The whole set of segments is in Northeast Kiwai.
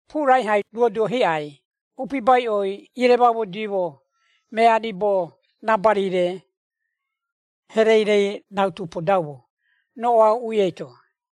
Puura ihai duoduo hiꞌai upibaiꞌoi ieremaumodiimo mea ribo raabari-re herei-re rautu podaumo roꞌoa uuꞌui eito.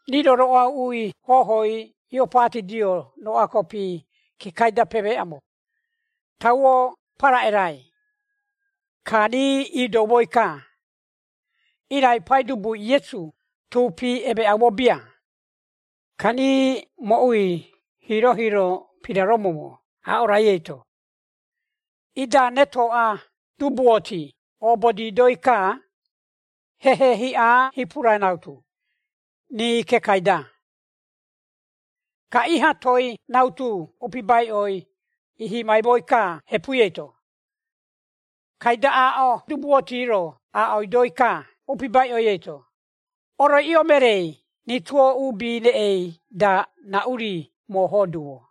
Rii-ro roꞌoa uuꞌui hohoi ioopatidio roꞌoa kopi kekai-da pemeeꞌaumo, tauo paraꞌerai. Ka rii iidoumoi-ka, irai Paidubui Iesu tuupi emeeꞌaumo bia. Ka rii mooꞌui hiiro-hiiro piraromoumo aaꞌo rai eito, ida retoꞌa dubuoti iobodidoi-ka hehe hiꞌa hipura rautu, rii kekai-da. Ka iha toei rautu upibaiꞌoi ihimaimoi-ka, hepui eito, kaida aaꞌo dubuoti-ro aaꞌoidoi-ka upibaiꞌoi eito, “Oroiꞌio mereei rituo uubi reꞌei-da, raꞌu-ri moohoo duumo?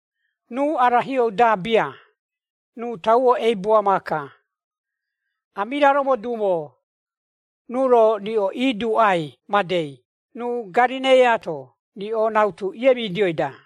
Ruu arahiou-da bia, ruu tauo eibua maaka! Amiraromo duumo, ruu-ro riꞌo iduuꞌai madei ruu Garereiaato riꞌo rautu iemidioi-da?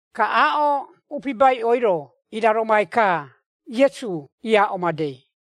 Ka aaꞌo upibaiꞌoi-ro iraromaimoi-ka Iesu iaaꞌo madei.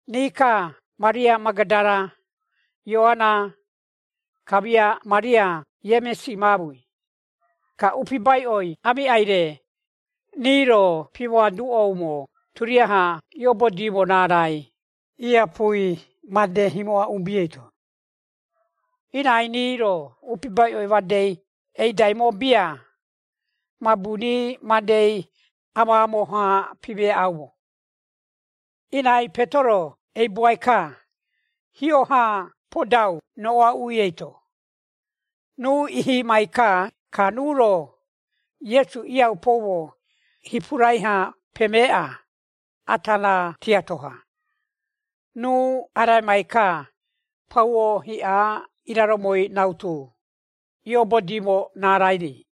Rii-ka Maria Magadara, Ioara, kamia Maria Iemisi maamui, ka upibaiꞌoi aamiꞌai-re, rii-ro pimoaduꞌoumo turiaha iiobodimo raarai iiapui made himoꞌa uubi eito. Irai rii-ro upibaiꞌoi madei eidaimo bia, mabu rii madei amaamo-ha pimeeꞌaumo. Irai Petero eibuai-ka, hio-ha podau roꞌoa uuꞌui eito, ruu ihimai-ka, ka ruu-ro Iesu iiaupoumo hipurai-ha pemeeꞌa, ata raa tiato-ha, ruu araimai-ka pauo hiꞌa iraromoi rautu ioobodiimo raarai-ri.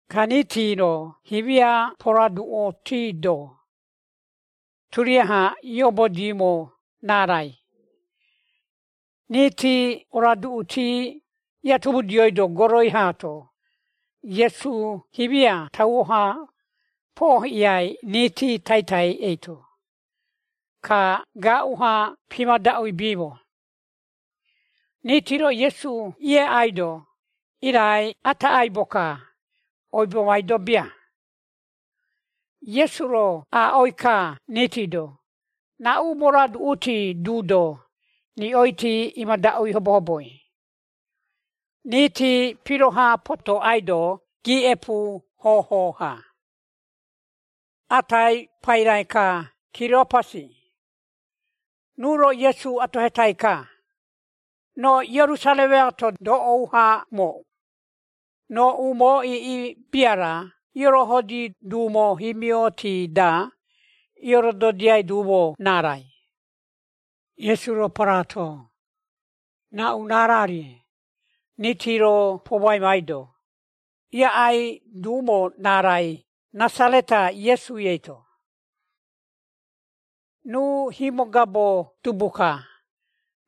ka riiti-ro himia poroaduꞌutiido turiaha irododiaimo raarai. Riiti oroaduꞌuti iatomudioido, goroi haato Iesu himia tauo-ha poohiꞌiai riiti taitai eito, ka gaaꞌu-ha pimadaꞌuibiimo. Riiti-ro Iesu ieaꞌaido, irai ata aibo-ka, oibomaido bia. Iesu-ro aaꞌoi-ka riiti-do, “Raꞌu moroaduꞌuti duido, riꞌoiti imadaꞌui hobohoboi?” Riiti piroha potoꞌaido giiꞌepu hoho-ha. Atai, paira-ka Kiriopasi, ruu-ro Iesu atohetai-ka, “Roo Ierusaremai-to doꞌou-ha amooꞌu, roo umoo iiꞌi bia-ra iorohodi duumo himioti-da iiorododiai duumo raarai?” Iesu-ro paraato, “Raꞌu raara-rie?” Riiti-ro pomoaimaido, “Iaꞌai duumo raarai Rasareta Iesui eito. Ruu himogabo dubu-ka,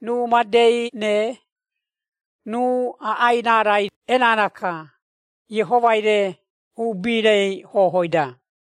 ruu madei-re, ruu iaꞌai raarai erara-ka Iehomai-re uubi-rei hohoi-da.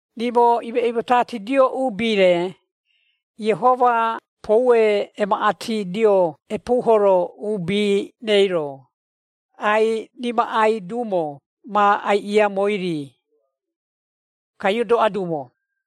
Rimo imeiꞌimotatidio uubi-re, Iehoma poue emaꞌatidio epuuhoro uubi-reiro, ai-imaꞌai duumo ma aiꞌiaumoi-ri, ka iodoꞌa duumo.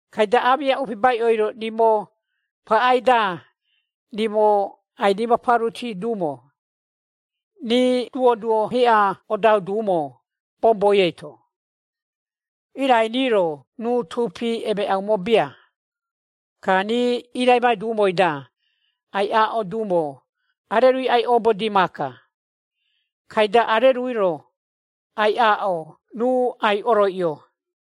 Kaida aamiꞌa upibaiꞌo-ro rimo paꞌai-da, rimo ai-rimaparuti duumo, rii duoduo hiꞌa odau duumo boboi eito, irai rii-ro ruu tuupi emeeꞌaumo bia. Ka rii iiraimai duumoi-da, ai-aaꞌo duumo, arerui ai-oobodii maaka, kaida arerui-ro ai-aaꞌo ruu ai-oroiꞌio.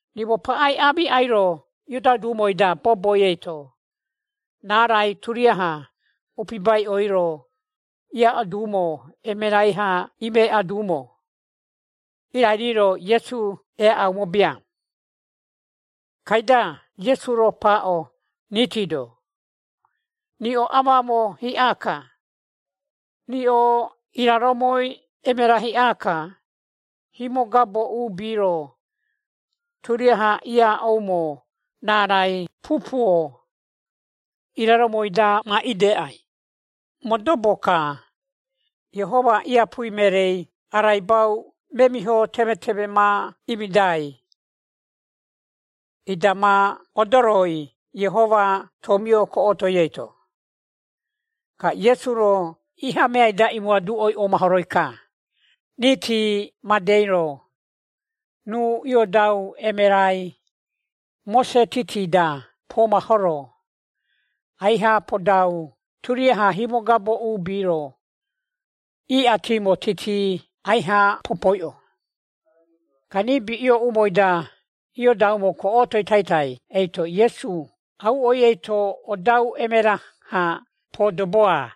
Rimo paꞌai aamiꞌai-ro iodau duumoi-da boboi eito, raarai turiaha upibaiꞌoi-ro iaaꞌo duumo emerai-ha imeꞌa duumo, irai rii-ro Iesu eaꞌaumo bia.” Kaida Iesu-ro paaꞌo riiti-do, “Riꞌo amaamo hiꞌa-ka! Riꞌo iraromoi emera hiꞌa-ka, himogabo uubi-ro turiaha iaaꞌoumo raarai pupuo iraromoi-da ma ideꞌai! Modobo-ka, Iehoma iapui mereei araibau memiho temeteme ma imidai, ida ma odoroi Iehoma tomioi goroi eito.” Ka Iesu-ro iha meai-da imoaduꞌoi omahoroi-ka, titi-madei-ro, ruu iioaduꞌo emerai, Mose titi-da pomahoro, aiha podau turiaha himogabo uubi-ro, iꞌatimo titi aiha pipoiꞌo. Ka riibi iooꞌumoi-da iodaumo goꞌotoi taitai eito, Iesu auꞌoi eito odau emera-ha podoboa.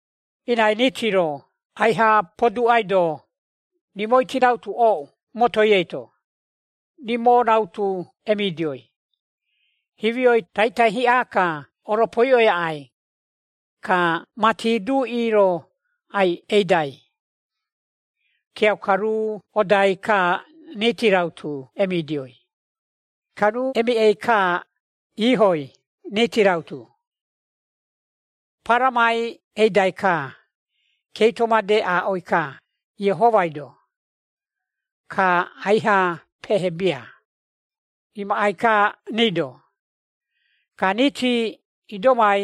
Irai riiti-ro aiha poduꞌaido, rimoiti rautu ooꞌu motoi eito, “Rimo rautu emidioi, himioi taitai hiꞌa-ka oropoiꞌoi aꞌai, ka mati duꞌi-ro ai-eidai.” Kiauka, ruu odai-ka rii rautu emidioi. Ka ruu emiꞌei-ka iihoi, riiti rautu, paramai eidai-ka, keito made aaꞌoi-ka Iehomai-do, ka aiha pehebia, imaꞌai-ka rii-do. Ka riiti idomai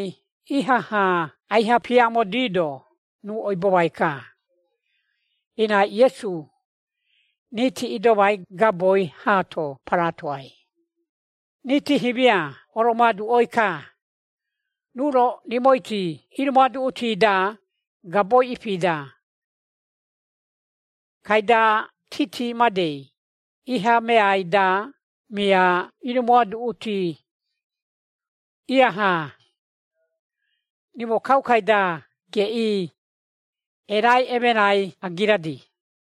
ihaha aiha piamodiido ruu oibomai-ka, irai Iesu riiti idomai gaboi haato paraatoai. Riiti himia oromoaduꞌoi-ka, “Ruu-ro rimoiti irimoaduꞌuti-da gaboi ipi-da, kaida titi-madei iha meai-da mia irimoaduꞌuti, iaha, rimo kaukai-da geꞌii erai emerai agiradi?”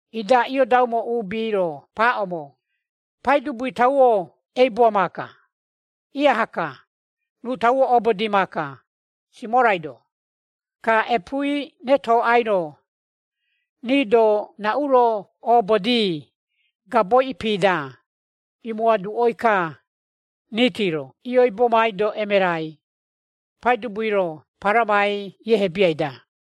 ida iodabuaimo uubi-ro paaꞌoumo, “Paidubui, tauo eibua maaka, ihaha-ka! Ruu tauo oobodi maaka, Simorai-do!” Ka epuui retoꞌai-ro, rii-do raꞌu-ro oobodi gabo ipi-da, imoaduꞌoi-ka, riiti-ro ioibomaido emerai, Paidubui-ro paramai iehebiai-da.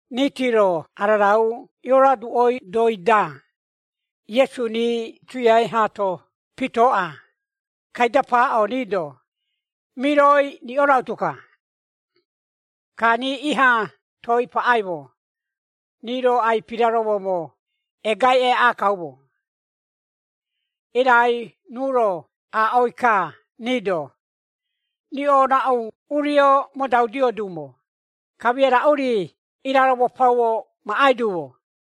Riiti-ro ararau ioroaduꞌoidoi-da, Iesu rii tuiai haato pitooꞌa, kaida paaꞌo rii-do, “Miroi riꞌo rautu-ka.” Ka rii iha toei paꞌaimo, rii-ro ai-piraromoumo egai eaꞌa kaumo. Irai ruu-ro aaꞌoi-ka rii-do, “Riꞌo raꞌu urio modaudio duumo, kamia raꞌu-ri iraromo pauo maꞌai duumo?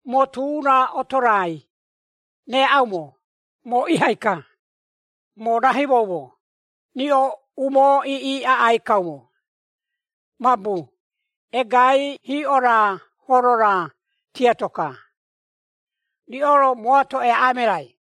Moo tu-ra oto-rai reaꞌaumo, moo ihai-ka. Moo raihimoumo, riꞌo umoo iiꞌi aꞌai kaumo, mabu egai hiꞌo-ra horo-ra tiato-ka, riꞌo-ro mooato eaꞌa emerai.”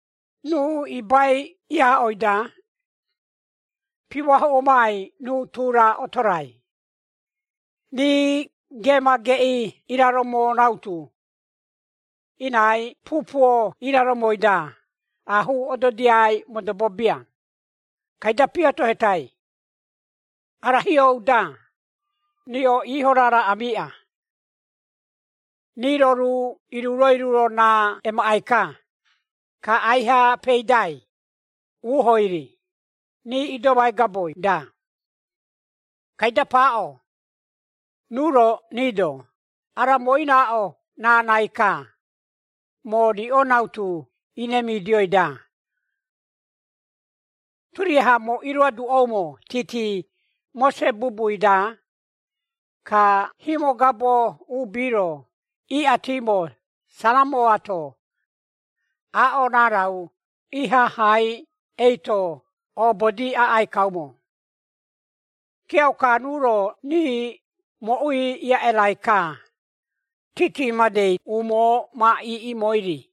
Ruu ibai iaaꞌoi-da, pimoahuꞌomai, ruu tu-ra oto-rai. Rii geema geꞌii iraromo rautu, irai pupuo iraromoi-da aahuu ododiai modobo bia, kaida piatohetai, “Ara hiou-da, riꞌo iiho raara amiiꞌa?” Rii-ro ruu iruro-iruro raa emaꞌai-ka, ka aiha peidai, uuhoi-ri, rii idomai gaboi-da. Kaida paaꞌo ruu-ro rii-do, “Ara moo iraaꞌo raarai-ka, moo riꞌo rautu iremidioi-da, turiaha moo iroaduꞌoumo titi, Mose bubui-da, ka himogabo uubi-ro iꞌatimo, Saramoaato, aaꞌo raarai ihahai eito obodi aꞌai kaumo.” Kiauka ruu-ro rii mooꞌui iaꞌerai-ka, titi-madei umoo ma iiꞌimoi-ri.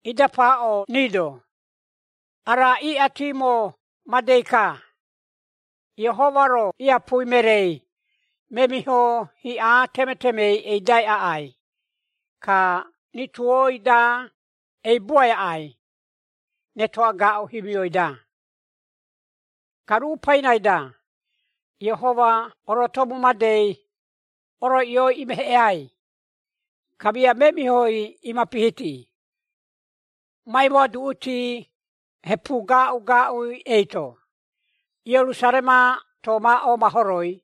Ida paaꞌo rii-do, “Ara iꞌatimo madei-ka, Iehoma-ro iapui mereei, memiho hiꞌa temetemei eidai aꞌai, ka rituoi-da eibua aꞌai, retoꞌa-gaaꞌu himioi-da. Ka ruu pairai-da, Iehoma orotomu madei, oroiꞌioi imeheꞌeai, kamia memihoi imapihiti, ma imoaduꞌuti hepu gaaꞌu-gaaꞌu eito. Ierusaremaato, ma omahoroi.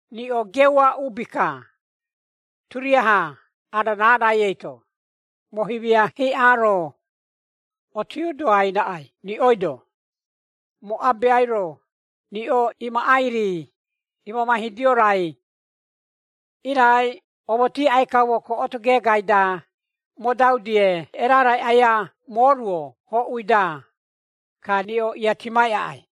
Riꞌo geua uubi-ka, turiaha ara raarai eito. Moo himia hiꞌa haa-ro otiodoai raꞌai riꞌoi-do, moo Abeai-ro riꞌo imaꞌai-ri, iimamaihidio raai. Irai omoti aꞌai kaumo goꞌoto geegai-da, modau-die erarai aia mooruo hoꞌui-da, ka riꞌo iatimai aꞌai.”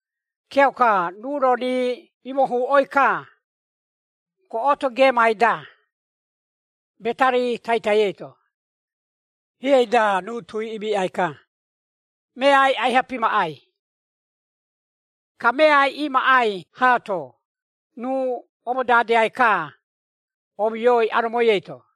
Kiauka, ruu-ro rii imohuꞌoi-ka goꞌoto geemai-da, Betari taitai eito, hiei-da ruu tui imiꞌai-ka, meai aiha pimaꞌai. Ka meai imaꞌai haato, ruu omodadeai-ka, omioi aromoi eito.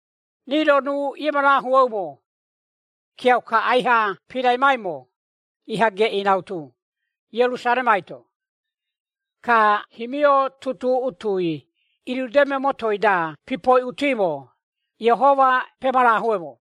Rii-ro ruu iemarahueumo, kiauka aiha piraimaimo, iha geꞌii rautu, Ierusaremai-to. Ka himio tutuꞌutui irudeme motoi-da pipoiꞌutimo, Iehoma pemarahueumo.